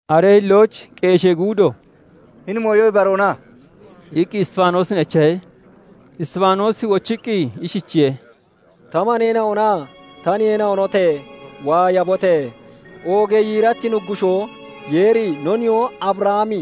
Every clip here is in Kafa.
Aree hillooch qeeshee guudo "Hini mooyo ibaroona?" iqqi Isxifaanoosin echahe. Isxifaanoosi wochiqqi ishichiye:- "Ta maneena'onaa ta niheena'onote! Waayabote! Oogee yiirachi Nuggushoo Yeeri, no nihoo Abrahami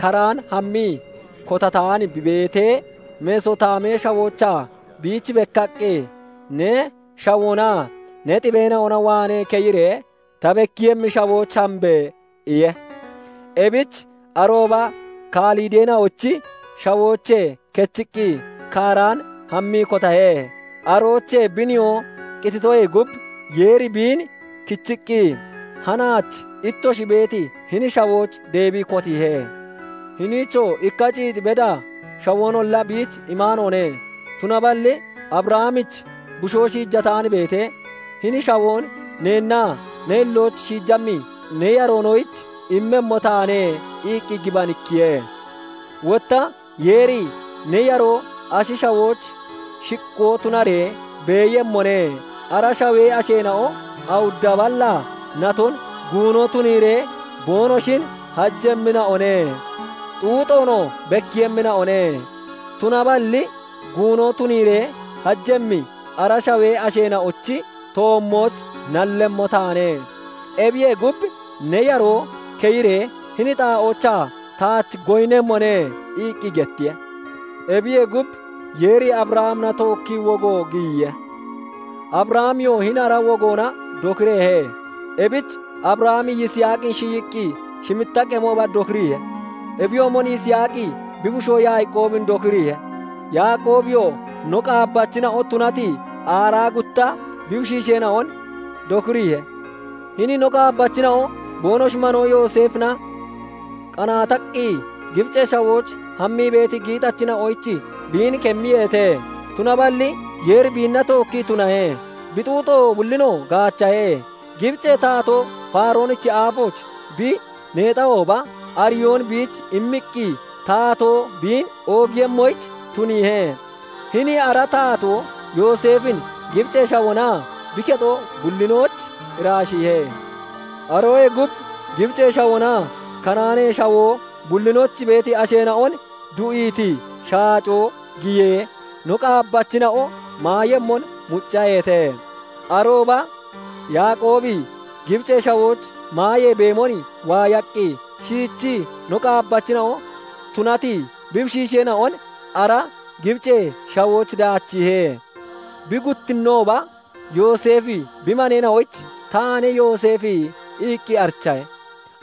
Karaan hammii kotataan bi beetee, Mesotaamee Shawoochaa biich bekkaqqi, 'Ne shawoonaa ne xibeena'ona waanee keyiree ta bekkiiyemmi shawooch hambe!' iye. "Ebich arooba Kalideena'ochi shawoochee kechiqqi, Karaan hammii kotahe. Aroochee bi nihoo qititoyee gub, Yeeri biin kichiqqi hanaach ittoshi beeti hini shawooch deebii kotiihe. Hiniichoo ikka ciix beda shawoonolla biich imaanoone. Tunaballi Abrahamich bushoo shiijataan beetee, 'Hini shawoon neennaa ne hillooch shiijammi ne yaroonoyich immemmo taane' iqqi gibanikkiye. Wotta Yeeri 'Ne yaroo ashi shawooch shiqqoo tunaree beeyemmone. Ara shawee asheena'o awudda balla naton guuno tuniiree boonoshin hajemmina'o ne; xuuxoonoo bekkiiyemmina'o ne. Tunaballi guuno tuniiree hajemmi ara shawee asheena'ochi toommooch nallemmo taane; ebiyee gub, ne yaroo keyiree hini xaa'oochaa taach goyinnemmone' iqqi gettiye. Ebiyee gub, Yeeri Abrahamina tookkii wogo giyiye. Abrahamiyoo hini ara wogoona dokireehe. Ebich Abrahami Yisaaqin shiyiqqi shimitta qemooba dokiriihe. Ebiyoomon Yisaaqi bi bushoo Yaaqoobin dokiriihe; Yaaqoobiyoo no qaabbachina'o tunati aaraa gutta bi bushiisheena'on dokiriihe. "Hini no qaabbachina'o boonoshi manoo Yooseefina qanaataqqi Gibicee Shawooch hammii beeti giixachina'oyich biin kemmiyeete. Tunaballi Yeeri biinna tookkii tunahe; bi xuuxo bullinoo gaachahe; Gibicee taatoo Faaroonichi aafooch bi neexahooba, ariyoon biich immiqqi taatoo biin oogiiyemmoyich tuniihe. Hini ara taatoo Yooseefin Gibicee Shawoonaa bi kexo bullinooch iraashiihe. "Aroyee gub Gibicee Shawoonaa Kanaanee Shawoo bullinooch beeti asheena'on du'iiti shaacoo giyee, no qaabbachina'o maayemmon muccaheete. Arooba Yaaqoobi Gibicee Shawooch maayee beemon waayaqqi, shiichii no qaabbachina'o tunati bi bushiisheena'on ara Gibicee Shawooch daachiihe. Bi guttinnooba Yooseefi bi maneena'oyich 'Taane Yooseefi' iqqi arichahe;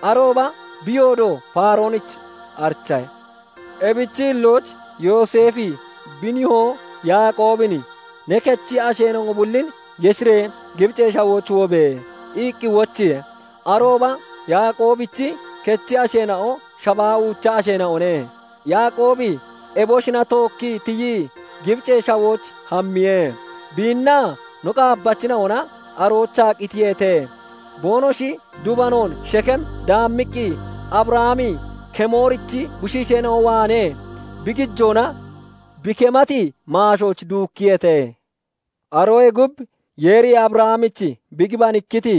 arooba bi yoodo Faaroonich arichahe. Ebichi hillooch Yooseefi bi nihoo Yaaqoobin 'Ne kechi asheena'o bullin yeshiree Gibicee Shawooch wobe!" iqqi wochiihe. Arooba Yaaqoobichi kechi asheena'o shabaa uucha asheena'one. Yaaqoobi eboshina tookkii tiyii, Gibicee Shawooch hammiye; biinnaa no qaabbachina'ona aroochaa qitiyeete. Boonoshi dubanoon Shekeem daammiqqi Abrahami Kemoorichi bushiisheena'o waanee bi gijoona bi kemati maashooch duukkiyeete. "Aroyee gub Yeeri Abrahamich bi gibanikkiti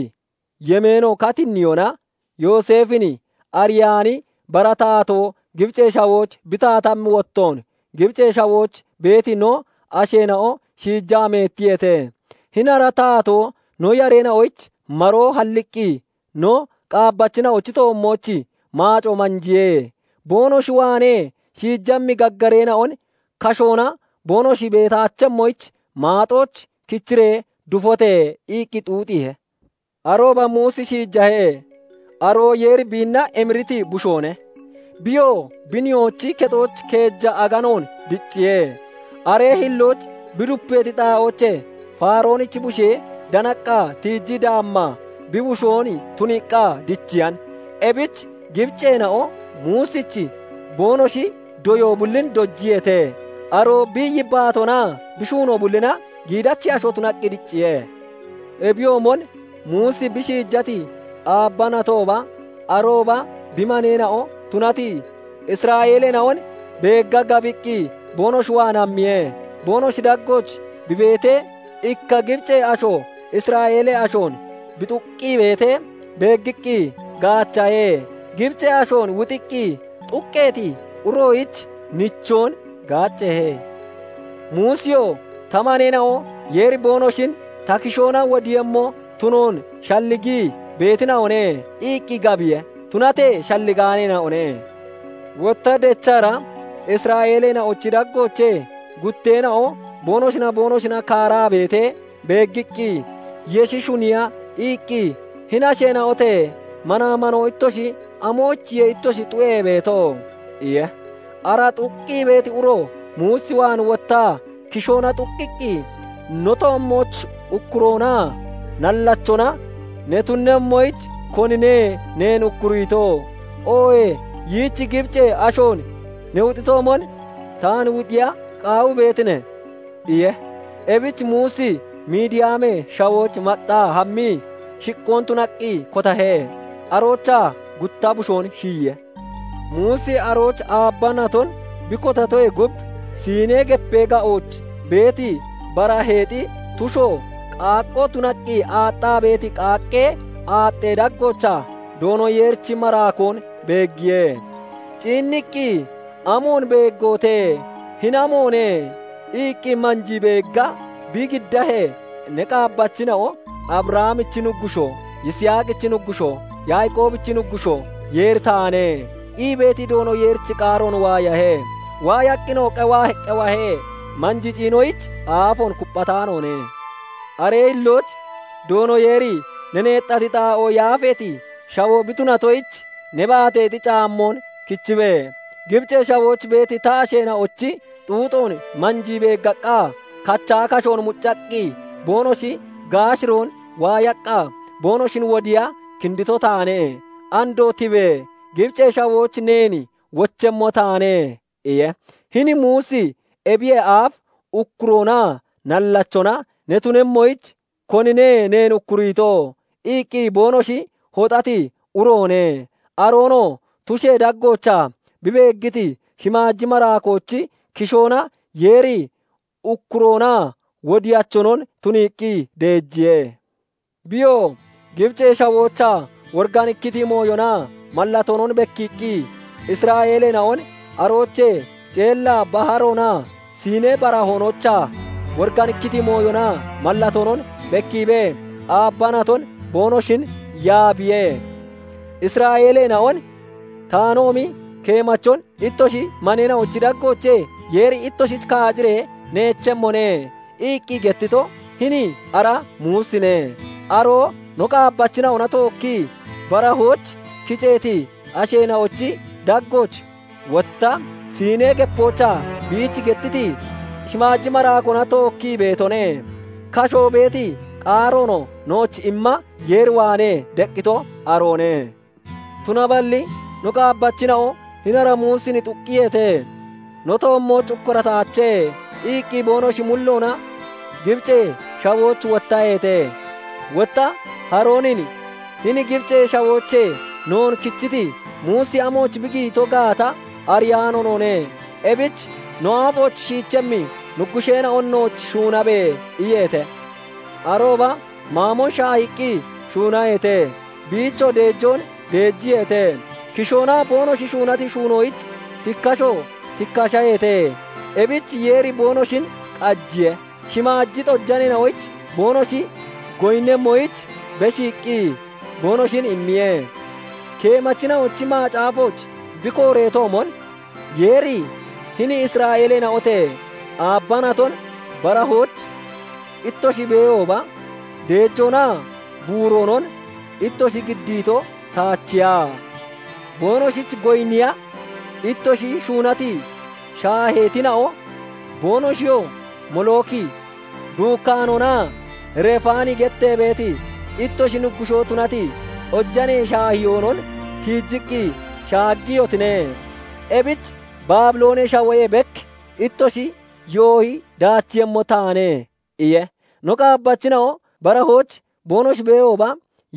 yemeeno katinniyona, Yooseefin ariyaani bara taatoo Gibicee Shawooch bi taatammi wottoon, Gibicee Shawooch beeti no asheena'o shiijaa meettiyeete. Hini ara taatoo no yareena'oyich maroo halliqqi no qaabbachina'ochi toommooch maacoo manjiye; 'boonoshi waanee shiijammi gaggareena'on kashoona boonoshi beetaachemmoyich, maaxooch kichiree dufote!' iqqi xuuxiihe. "Arooba Muusi shiijahe; aroo Yeeri biinna emiriti bushoone. Biyoo bi nihoochi kexooch keeja aganoon dicciye; aree hillooch bi dupeeti xaa'oochee Faaroonichi bushee danaqqa tiijii daammaa, bi bushoon tuniiqqa dichiyan. Ebich Gibiceena'o Muusich boonoshi doyoo bullin dojiyeete; aroo bi yibbaatoonaa bi shuunoo bullina giidachi asho tunaqqi dicciye. "Ebiyoomon Muusi bi shiijati aabba natooba, arooba bi maneena'o tunati Isra'eeleena'on beegga gabiqqi, boonoshi waan hammiye. Boonoshi daggooch bi beetee, ikka Gibicee asho Isra'eelee ashoon bi xuqqii beetee beeggiqqi gaachahe; Gibicee ashoon wuxiqqi xuqqeeti uroyich nichoon gaaceehe. Muusiyoo 'Ta maneena'o Yeeri boonoshin ta kishoona wodiiyemmo tunoon shalligii beetina'one' iqqi gabiye; tunatee shalligaaneena'one. Wotta dechara Isra'eeleena'ochi daggoochee gutteena'o boonoshinaa boonoshina kaaraa beetee beeggiqqi, yeshi shuniiya iqqi, 'Hini asheena'ote! Manaa manoo ittoshi amoyichiye ittoshi xu'ee beeto?' iye. "Ara xuqqi beeti uro, Muus waan wottaa kishoona xuqqiqqi, 'No toommooch ukkuroonaa nallachona ne tunemmoyich, konine neen ukkuriito? Oohee yiich Gibicee ashoon ne wuxitoomon, taan wuxiya qaawii beetine?' iye. Ebich Muusi Midiyaamee Shawooch maxxaa hammii, shiqqoon tunaqqi kotahe; aroochaa gutta bushoon shiyiye. "Muusi arooch aabba naton bi kotatoyee gub, Siinee Gepee ga'ooch beeti baraheexi tusho qaaqqoo tunaqqi aaxxaa beeti qaaqqee aaxxee daggoochaa Doono Yeerichi maraakoon beeggiye. Ciinniqqi, 'Amoon beeggootee! Hini amoone?' iqqi manjii beegga bi giddahee, 'Ne qaabbachina'o Abrahamichi Nuggushoo, Yisaaqichi Nuggushoo, Yaaqoobichi Nuggushoo Yeeri taane' ii beeti Doono Yeerichi qaaroon waayahe. Waayaqqinoo qewahe; manjii ciinoyich aafoon kupphataanoone. "Aree hillooch Doono Yeeri 'Ne neexati xaa'oo yaafeeti shawoo bi tunatoyich, ne baateexi caammoon kichibe! Gibicee Shawooch beeti ta asheena'ochi xuuxoon manjii beeggaqqa, kachaa kashoon muccaqqi boonoshi gaashiron waayaqqa, boonoshin wodiiya kindito taane. Andoo tibe! Gibicee Shawooch neen wochemmo taane' iye. "Hini Muusi ebiyee aaf 'Ukkuroonaa nallachona ne tunemmoyich konine neen ukkuriito?' iqqi boonoshi hoxati uroone. Aroonoo tushee daggoochaa bi beeggiti shimaaji maraakoochi kishoona Yeeri ukkuroonaa wodiyachonon tuniiqqi deejiye. Biyoo Gibicee Shawoochaa woriganikkiti mooyonaa mallatoonon bekkiiqqi, Isra'eeleena'on aroochee Ceella Baharoonaa Siinee Barahoonoochaa woriganikkiti mooyonaa mallatoonon bekkiibee, aabba naton boonoshin yaabiye. Isra'eeleena'on 'Taanoomi keemachon ittoshi maneena'ochi daggoochee Yeeri ittoshich kaaciree neechemmone' iqqi gettito hini ara Muusine. Aroo no qaabbachina'ona tookkii barahooch kiceeti asheena'ochi daggooch, wotta Siinee Gepoochaa biich gettiti shimmaji maraakoona tookkii beetone. Kasho beeti qaaroonoo nooch imma Yeer waanee deqqito aroone. "Tunaballi no qaabbachina'o hini ara Muusin xuqqiyeete; 'No toommooch ukkurataache' iqqi boonoshi mulloona Gibicee Shawooch wottaheete. Wotta Haroonin 'Hini Gibicee Shawoochee noon kichiti Muusi amooch bi giyito gaata ariyaano noone; ebich no aafooch shiichemmi nuggusheena'on nooch shuunabe!' iyeete. Arooba maamon shaahiiqqi shuunaheete; biichoo deejoon deejiyeete; kishoona boonoshi shuunati shuunoyich tikkasho tikkashaheete. Ebich Yeeri boonoshin qajiye; shimaaji xojaneena'oyich boonoshi goyinnemmoyich beshiiqqi boonoshin immiye. Keemachina'ochi macaafooch bi kooreetoomon, 'Yeeri "Hini Isra'eeleena'ote! Aabba naton barahooch ittoshi beehooba, deejoonaa buuroonon ittoshi giddiito taachiya? Boonoshich goyinniya ittoshi shuunati shaaheetina'o, boonoshiyoo Molooki duukkaanoonaa Refaani gettee beeti, ittoshi nuggushoo tunati xojanee shaahiyoonon tiijiqqi shaaggiyotine. Ebich Baabiloonee Shawoyee bek ittoshin yoohi daachiiyemmo taane" iye. "No qaabbachina'o barahooch boonoshi beehooba,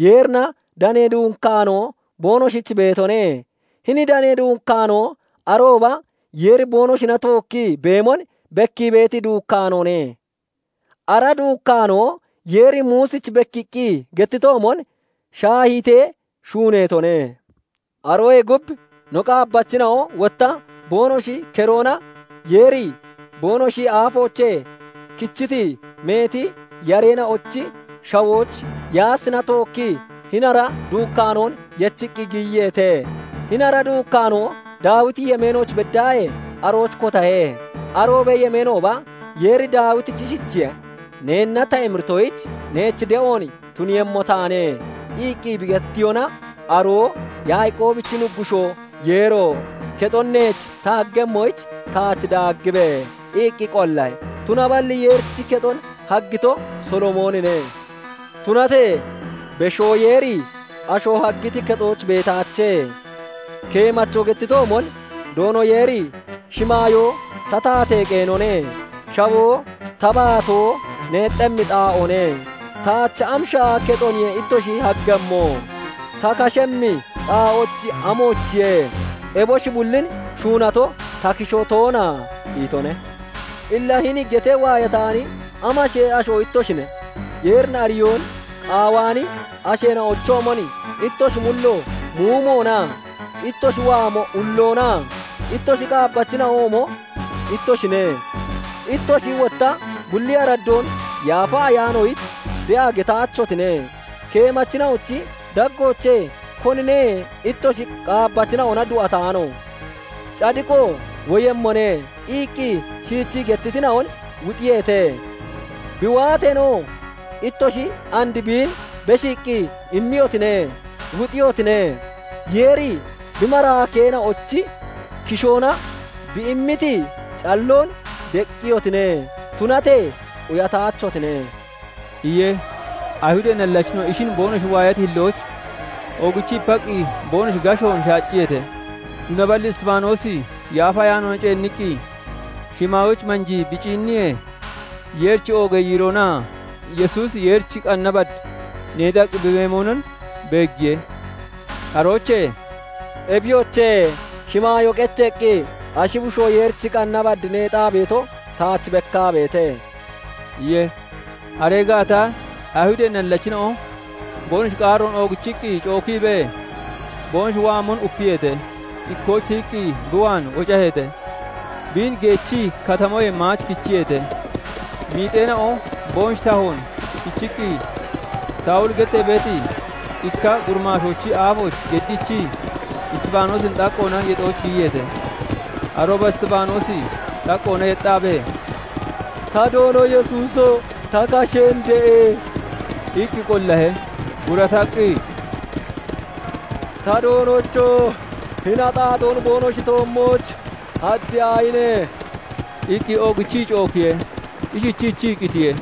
Yeerina danee duukkaanoo boonoshich beetone; hini danee duukkaanoo arooba Yeeri boonoshina tookkii beemon bekkii beeti duukkaanoone. Ara duukkaanoo Yeeri Muusich bekkiiqqi gettitoomon shaahiitee shuuneetone. Aroyee gub no qaabbachina'o wotta boonoshi keroona Yeeri boonoshi aafoochee kichiti meeti yareena'ochi shawooch Yaasina tookkii hini ara duukkaanoon yechiqqi giyiyeete. Hini duukkaanoo Daawiti yemeenooch beddaahee arooch kotahe. Aroobee yemeenooba Yeeri Daawitich ishichiye:- 'Neenna ta emiritoyich neech de'oon tuniiyemmo taane' iqqi bi gettiyona, aroo 'Yaaqoobichi Nuggushoo Yeero! Kexon neech ta haggemmoyich taach daaggibe!' iqqi qollahe. Tunaballi Yeerichi kexon haggito Solomoonine. "Tunatee Beshoo Yeeri asho haggiti kexooch beetaache; keemacho gettitoomon, 'Doono Yeeri "Shimaayoo ta taatee qeenone; Shawoo ta baatoo neexxemmi xaa'oone; taach am shaaha kexoniye ittoshi haggemmo? Ta kashemmi xaa'ochi, amoochiye? Eboshi bullin shuunato ta kishoo toona?" itone.' "Illa hini getee waayataani amashee asho ittoshine? Yeerin ariyoon qaawaani asheena'ochoomon ittoshi mulloo muumoona? Ittoshi waamo ulloona? Ittoshi qaabbachina'oomo ittoshine; ittoshi wotta bulli araddoon Yaafa Ayaanoyich de'a getaachotine. Keemachina'ochi daggoochee konine ittoshi qaabbachina'ona du'ataano? 'Cadiqo woyemmone' iqqi shiichii gettitina'on wuxiyeete. Bi waateenoo, ittoshi and biin beshiiqqi immiyotine; wuxiihotine. Yeeri bi maraakeena'ochi kishoona bi immiti calloon deqqiyotine; tunatee quyataachotine" iye. Ayihudee nallachina'o ishin boonoshi waayati hillooch oogichii ipaqqi boonoshi gashon shaacciyeete. Tunaballi Isxifaanoosi Yaafa Ayaanoona ceenniqqi shimaayooch manjii bi ciinniyee, Yeerichi oogee yiiroonaa Yesuusi Yeerichi qanna bad neexaqqi bi beemonon beeggiye. Aroochee "Ebiyoche, shimaayoo qecheeqqi ashi bushoo Yeerichi qanna bad neexaa beeto taach bekkaa beete" iye. Aree gaata Ayihudee nallachina'o boonoshi qaaroon oogichiqqi cookiibee boonoshi waamon upiyeete; ikkooch tiyiqqi bi waan wocaheete; biin geechii katamoyee maach kichiyeete. Miixeena'o boonoshi tahoon kichiqqi, Sawuli gettee beeti ikka gurimaashoochi aafooch geddiichii, Isxifaanoosin xaqqoona yexooch giyiyeete. Arooba Isxifaanoosi xaqqoona yexxaabee, "Ta Doono Yesuuso! Ta kasheen de'e!" iqqi qollahe. Gurataqqi, "Ta Doonocho! Hini axaaxoon boonoshi toommooch haddiyaahine!" iqqi oogichii cookiye. Ishichiichii qitiye.